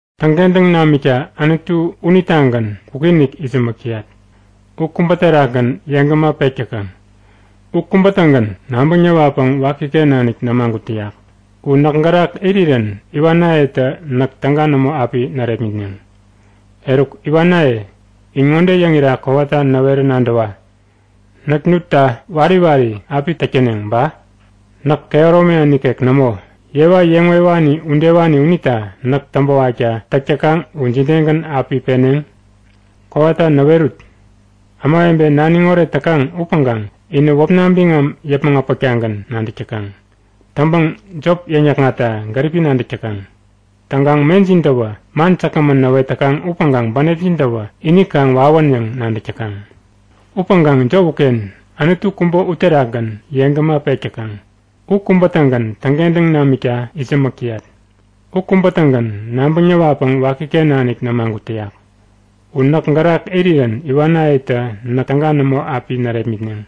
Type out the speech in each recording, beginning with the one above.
Täŋkentäŋ namikta Anutu unitagän kwikinik itsämäk täyat. U kubä terakgän yeŋgäma pek täkaŋ. U kubä-tägän nabäŋ näwatpäŋ wakiken nanik nämagut täyak. U näk gärak irirän iwanayetä näk täga nämo api närepmitneŋ. Eruk iwanaye, in ŋode yäŋira kowata näwerä nadäwa; Näk nutta wari wari api täk täneŋ ba? Näk kehäromina nikek nämo, yewa yeŋ wewani udewani unita näk täŋpäwakta täk täkaŋ u jidegän api peneŋ? Kowata näwerut! Ämawebe naniŋ oret täkaŋ upäŋkaŋ inä wäpna biŋam yäpmäŋ äpäktagän nadäk täkaŋ. Täŋpäŋ jop yäŋnäkŋatta gäripi nadäk täkaŋ. Täŋkaŋ mejintäwä man säkgämän näwet täkaŋ upäŋkaŋ bänepjin-täwä ini kaŋ wawän yäŋ nadäk täkaŋ. Upäŋkaŋ jop uken! Anutu kubä uterakgän yeŋgäma pek täkaŋ. U kubä-tägän täŋkentäŋ namikta itsämäk täyat. U kubä-tägän nabäŋ näwatpäŋ wakiken nanik nämagut täyak. U näk gärak irirän iwanayetä näk täga nämo api närepmitneŋ.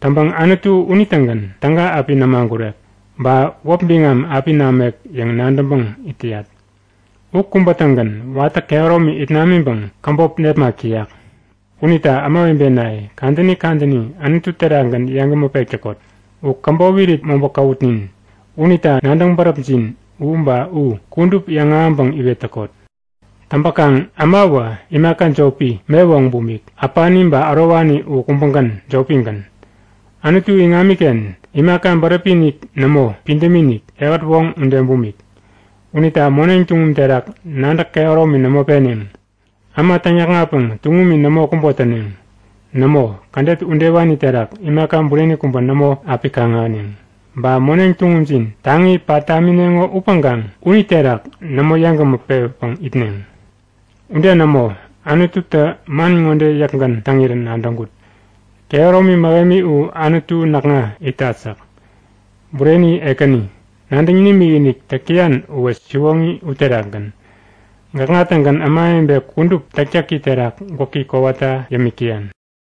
Täŋpäŋ Anutu unitägän täga api nämagurek, ba wäp biŋam api namek yäŋ nadäŋpäŋ it täyat. U kubä-tägän watä kehäromi it namiŋpäŋ käbop nepmak täyak. Unita ämawebenaye, kadäni kadäni Anutu terakgän yeŋgämä pek täkot. U käbop irit mobä käwutnin unita nadäŋ bäräpjin u ba u kudup yäŋahäŋpäŋ iwet täkot. Täŋpäkaŋ ämawä imaka jopi, me woŋ bumik. Äpani ba ärowani u kubägän, jopigän. Anutu iŋamiken imaka bäräpi-inik nämo, pidämi-inik, ehät woŋ ude bumik. Unita moneŋ tuŋum terak nadäk kehäromi nämo peneŋ. Äma täŋyäkŋatpäŋ tuŋumi nämo kubo täneŋ. Nämo, kädet udewani terak imaka bureni kubä nämo api kaŋ-ahäneŋ. Ba moneŋ tuŋumjin taŋi pat tamineŋo upäŋkaŋ uniterak nämo yeŋgämä pewäpäŋ itneŋ. Ude nämo! Anututä man ŋode yäkgän täŋirän nadäŋkut; Kehäromi mähemi u Anutu näkŋa itat yäk. Bureni Ekäni, nadäŋ nimikinik täk täyan uwä siwoŋi uterakgän. Gäkŋa-tägän ämawebe kudup täktäki terak gwäki kowata yämik täyan.